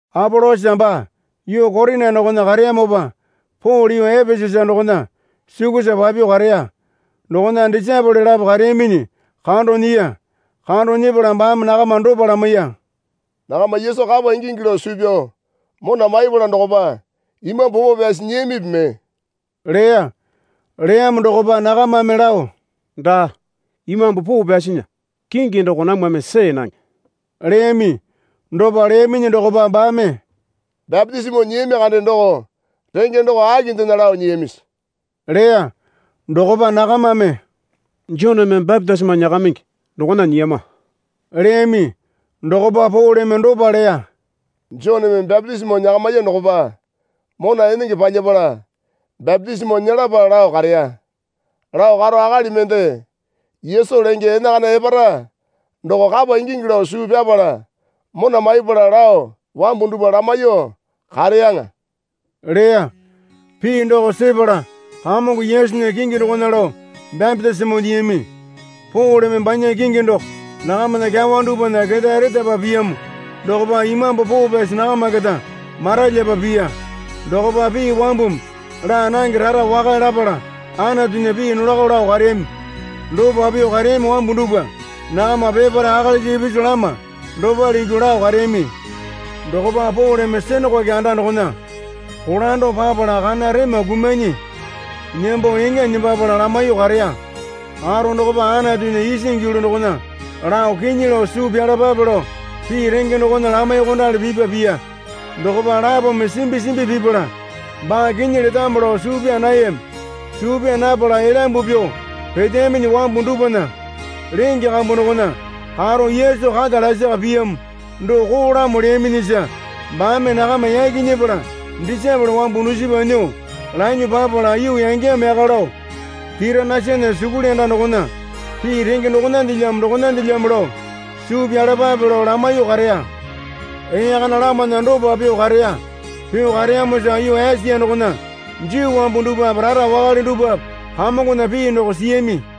Apolosa baa yuu Korina dokona kareyamopa Pole yuu Epesasa dokona sukusa papyuo kareya. Dokona disaepole lapo kareyaminyi kando nyiya. Kando nyepala baame nakama dopa lamaiya. Nakama Yesu kapa ingingi lao suu pyao mona maipala dokopa Imambu Poo Pyasi nyiyamipi mee? leya. Leyamo dokopa nakamame lao, Daa, Imambu Poo Pyasinya kingi doko namwame see nange leyami. Dopa leyaminyi dokopa baame, Bapitisimo nyiyami kande doko renge doko akindena lao nyiyamisi? leya. Dokopa nakamame, Joneme bapitisimo nyakamingi dokona nyiyama, leyami. Dokopa Poleme dopa leya. Joneme bapitisimo nyakamiya dokopa mona enenge palyapala bapitisimo nyelapa lao kareya. Lao karo akali mende Yesu lenge enakana epara doko kapa ingingi lao suu pyapala mona maipala lao wambu dupwa lamaiyuo kareyaŋa leya. Pii doko sepala Kamongo Yesunya kingi dokona lao bapitisimo nyiyami. Poleme banya kingi doko nakamana kyawa dupwana ketae retapa piyamo dokopa Imambu Poo Pyasi nakama keta maralyapa piya. Dokopa pii wambumi laa nange rara wakale lapala Anatunya pii nolako lao kareyami. Dopa pyuo kareyami wambu dupwa nakama peparae akalisa ipisu lama dopale ingyuo lao kareyami. Dokopa Poleme sinakoke anda dokona kolando papala kana rema kumanyi nembo eŋa nembapala lamaiyuo kareya. Karo dokopa Anatunya isingi yulu dokona lao kinyi lao suu pyalapape lao pii renge dokona lamaiyuokondali pipa piya. Dokopa lapome simbi simbi pipala baa kinyi letamo lao suu pyaa nayami. Suu pyaa napala elyambu pyuo peteyaminyi wambu dupwana lenge kambu dokona karo Yesu kata lasaka piyamo doko koolamo leyaminyisa baame nakama yaki nyepala disaepole wambu dusipa nyuo lanyuo papala yuu yangeyamo yaka lao Tiranasana sukuli anda dokona pii renge dokonandelyamo dokonandelyamo lao suu pyapalapape lao lamaiyuo kareya. Ee kana lamana dopa pyuo kareya. Pyuo kareyamosa yuu Esia dokona Juu wambu dupwape rara wakale dupwape Kamongona pii doko siyami.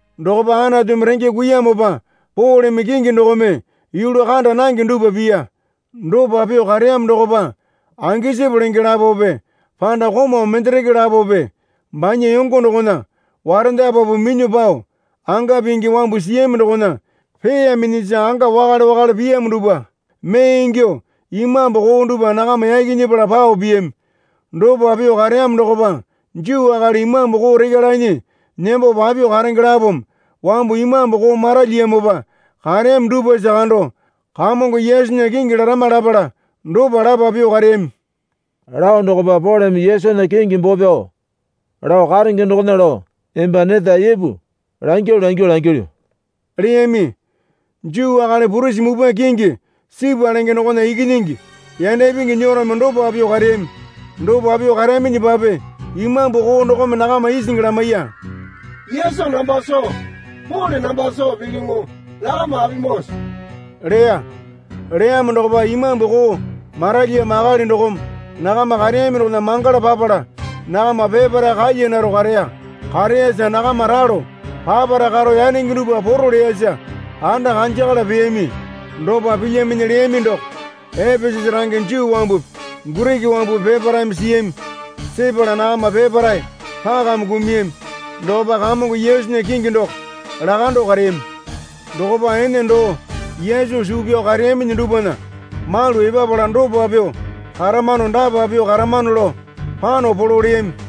Dokopa Anatumi renge kuiyamopa Poleme kingi dokome yulu kanda nange dupwa piya. Dopa pyuo kareyamo dokopa angesipu lenge lapope panda komau mendereke lapope banya yongo dokona warendapapu minyuo pao anga pingi wambu siyami dokona peeyaminyisa anga wakale wakale piyamo dupwa mee ingyuo imambu koo dupwa nakama yaki nyepala pao piyami. Dopa pyuo kareyamo dokopa Juu akali imambu koo rekya lanyi nembo papyuo karenge lapome wambu imambu koo maralyiyamopa kareyami dupwasa kando Kamongo Yesunya kingi larama lapala dopa lapa pyuo kareyami. Lao dokopa Poleme Yesunya kingi boo pyao lao karenge dokona lao emba neta ipu langyalu langyuo langilyu leyami. Juu akali purisi mupwa kingi Sipa lenge dokona ikinyingi yanda ipingi nyerome dopa pyuo kareyami. Dopa pyuo kareyaminyipape imambu koo dokome nakama isingi lamaiya. Yesu namba soo, Pole namba soo pilyuŋu, nakama apimoowase? leya. Leyamo dokopa imambu koo maralyiyamo akali dokome nakama kareyami dokona mangala papala nakama peparae kalyanaro kareya. Kareyasa nakama ralo papara karo yanenge dupwa poro leyasa anda kanjakala peyami. Dopa pilyaminyi leyami doko Epesasa range Juu wambupi Giriki wambupi peparaeme siyami. Sepala nakama peparae pakame kumuyami. Dokopa Kamongo Yesunya kingi doko lakando kareyami. Dokopa ene doo Yesu suu pyao kareyaminyi dupwana malu epapala dopa pyuo karamano dapa pyuo karamano lao pano polo leyami.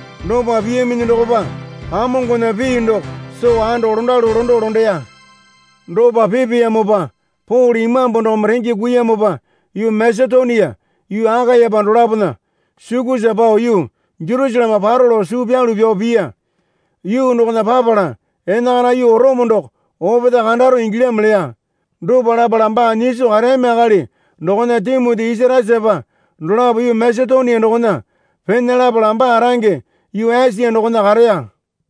Dopa piyaminyi dokopa Kamongona pii doko soo ando londalu londo londeya. Dopa pipeyamopa Pole Imambu dokome renge kuiyamopa yuu Masetonia yuu Akayape dolapona sukusa pao yuu Jersaleme paro lao suu pyalu pyao piya. Yuu dokona papala enakana yuu Orome doko opetae kandaro ingilyamo leya. Dopa lapala baa nyiso kareyami akali dokona Timoti Isasatasapa dolapo yuu Masetonia dokona pena lapala baa range yuu Esia dokona kareya.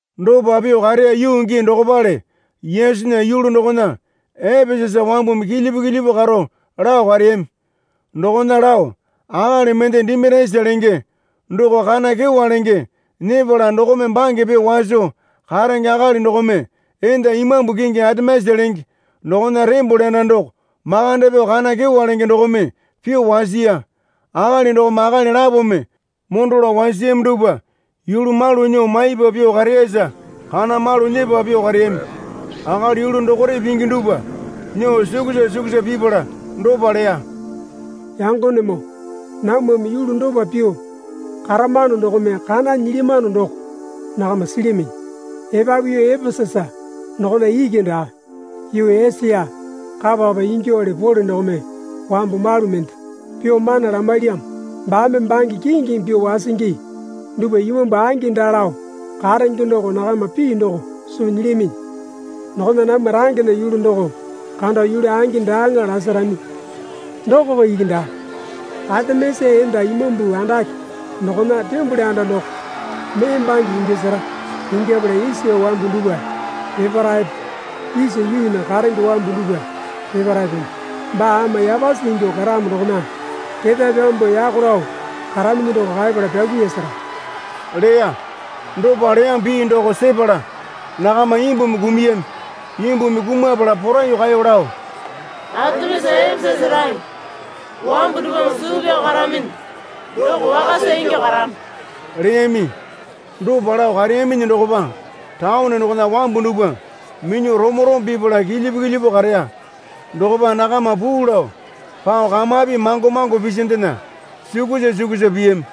Dopa pyuo kareya yuu gii dokopale Yesunya yulu dokona Epesasa wambumi kilyipu kilyipu karo lao kareyami. Dokona lao akali mende Dimitiasa lenge doko kana kyewa lenge nyepala dokome bange pyuo waso karenge akali dokome enda imambu kingi Atemisa lenge dokona tembole anda doko makande pyuo kana kyewa lenge dokome pyuo wasiya. Akali dokome akali lapome mondo lao wasiyami dupwa yulu malu nyuo maipa pyuo kareyasa kana malu nyepa pyuo kareyami. Akali yulu dokore pingi dupwa nyuo sukusa sukusa pipala dopa leya. Yangonemoo, namwame yulu dopa pyuo karamano dokome kana nyilyamano doko nakama silyaminyi. Epapu yuu Epesasa dokona iki daa, yuu Esia kapa kapa ingyuowale Pole dokome wambu malu mende pyuo mana lamailyamo. Baame bange kingimi pyuo wasingi dupwa imambu angi daa lao karenge doko nakama pii doko soo nyilyaminyi. Dokona namwa rangena yulu doko kando yulu angi daaŋa lasarami. Dokoko iki daa. Atemisa enda imambu andake dokona tembole anda doko mee bange ingyasara. Ingyapala Esia wambu dupwa peparaepe isa yuunya karenge wambu dupwa peparaepeme baa ama yapasi ingyuo karamo dokona ketae pyambuo yako lao karaminyi doko kaepala pyakuiyasara, leya. Dopa leyamo pii doko sepala nakama imbumi kumuyami. Imbumi kumapala poraiyuo kaeyo lao, Atemisa Epesasa range wambu dupwame suu pyao karaminyi doko wakasa ingyuo karamo leyami. Dopa lao kareyaminyi dokopa taone dokona wambu dupwa minyuo romo romo pipala kilyipu kilyipu kareya. Dokopa nakama puu lao pao kamapi mango mango pisindena sukusa sukusa piyami.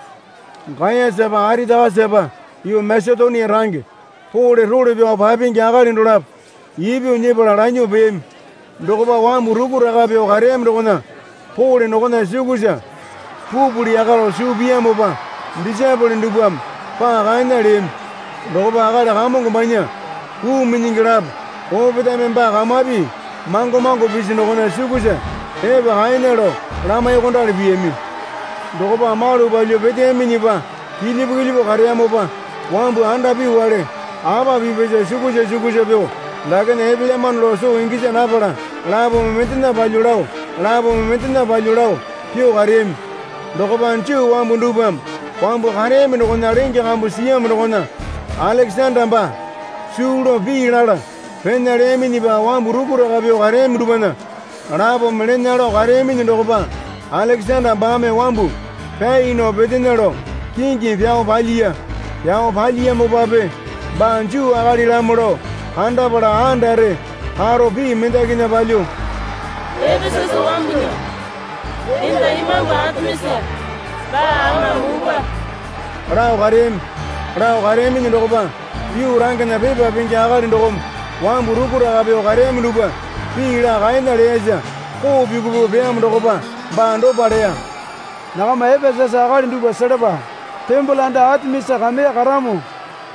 Gayasapa Aritakasapa yuu Masetonia range Pole role pyao papingi akali dolapo ipyuo nyepala lanyuo peyami. Dokopa wambu rukuraka pyuo kareyami dokona Pole dokona sukusa pupuli yaka lao suu piyamopa disaepole dupwame paa kaena leyami. Dokopa akali kamongo banya puu minyingi lapo opetaeme baa kamapi mango mango pisi dokona sukusa epa kaena lao lamaiyuokondali piyami. Dokopa malu palyuo peteyaminyipa kilyipu kilyipu kareyamopa wambu andapyuwale apa pipyasa sukusa sukusa pyuo dakena epelyamano lao soo gisa napala lapome mendena palyuo lao lapome mendena palyuo lao pyuo kareyami. Dokopa Juu wambu dupwame wambu kareyami dokona lenge kambu siyamo dokona Alekesanda baa suu lao pii lala pena leyaminyipa wambu rukuraka pyuo kareyami dupwana lapome lena lao kareyaminyi dokopa Alekesanda baame wambu pyai nao petena lao kingimi pyao palyiya. Pyao palyiyamopape baa Juu akalilamo lao kandapala andare karo pii mendakinya palyuo, Epesasa wambunya enda imambu Atemisa baa ama mupwa lao kareyami. Lao kareyaminyi dokopa yuu rangena pepa pingi akali dokome wambu rukuraka pyuo kareyami dupwa pii laa kaena leyasa koo pyuku pyuku peyamo dokopa baa dopa leya. Nakama Epesasa akali dupwa selapa. Tembole anda Atemisa kameya karamo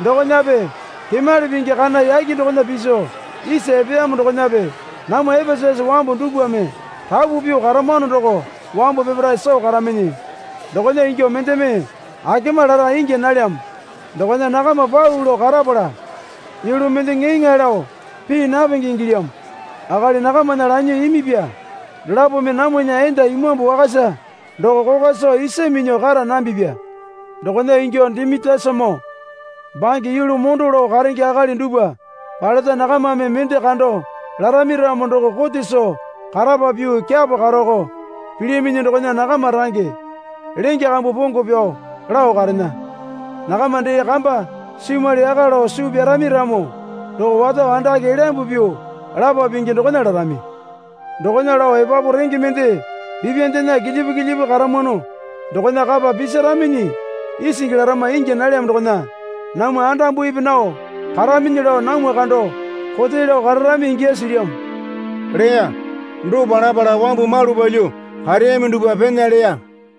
dokonape kemali pingi kana yake dokona piso isa epeyamo dokonape namwa Epesasa wambu dupwame rapu pyuo karamano doko wambu pepare soo karaminyi. Dokona ingyuo mendeme akema lara ingya nalyamo dokona nakama pau lao karapala yulu mende ŋeeŋae lao pii napenge ingilyamo. Akali nakamana lanyuo imipya dolapome namwana enda imambu wakasa doko kokwa soo isa minyuo kara nambipya. Dokona ingyuo Dimitiasamoo bange yulu mondo lao karenge akali dupwa paleta nakamame mende kando larami ramo doko kote soo karapa pyuo kyapo karoko pilyaminyi dokona nakama range lenge kambu pongo pyao lao karena. Nakama dee kamba simwali yaka lao suu pyarami ramo doko wato andake elyambu pyuo lapa pingi dokona larami. Dokona lao epapu renge mende pipyandena kilyipu kilyipu karamwano dokona kapa pisaraminyi isingi larama ingya nalyamo dokona namwa andambupi nao karaminyi lao namwa kando kote lao kararami ingyasi silyamo leya. Dopa lapala wambu malu palyuo kareyami dupwa pena leya.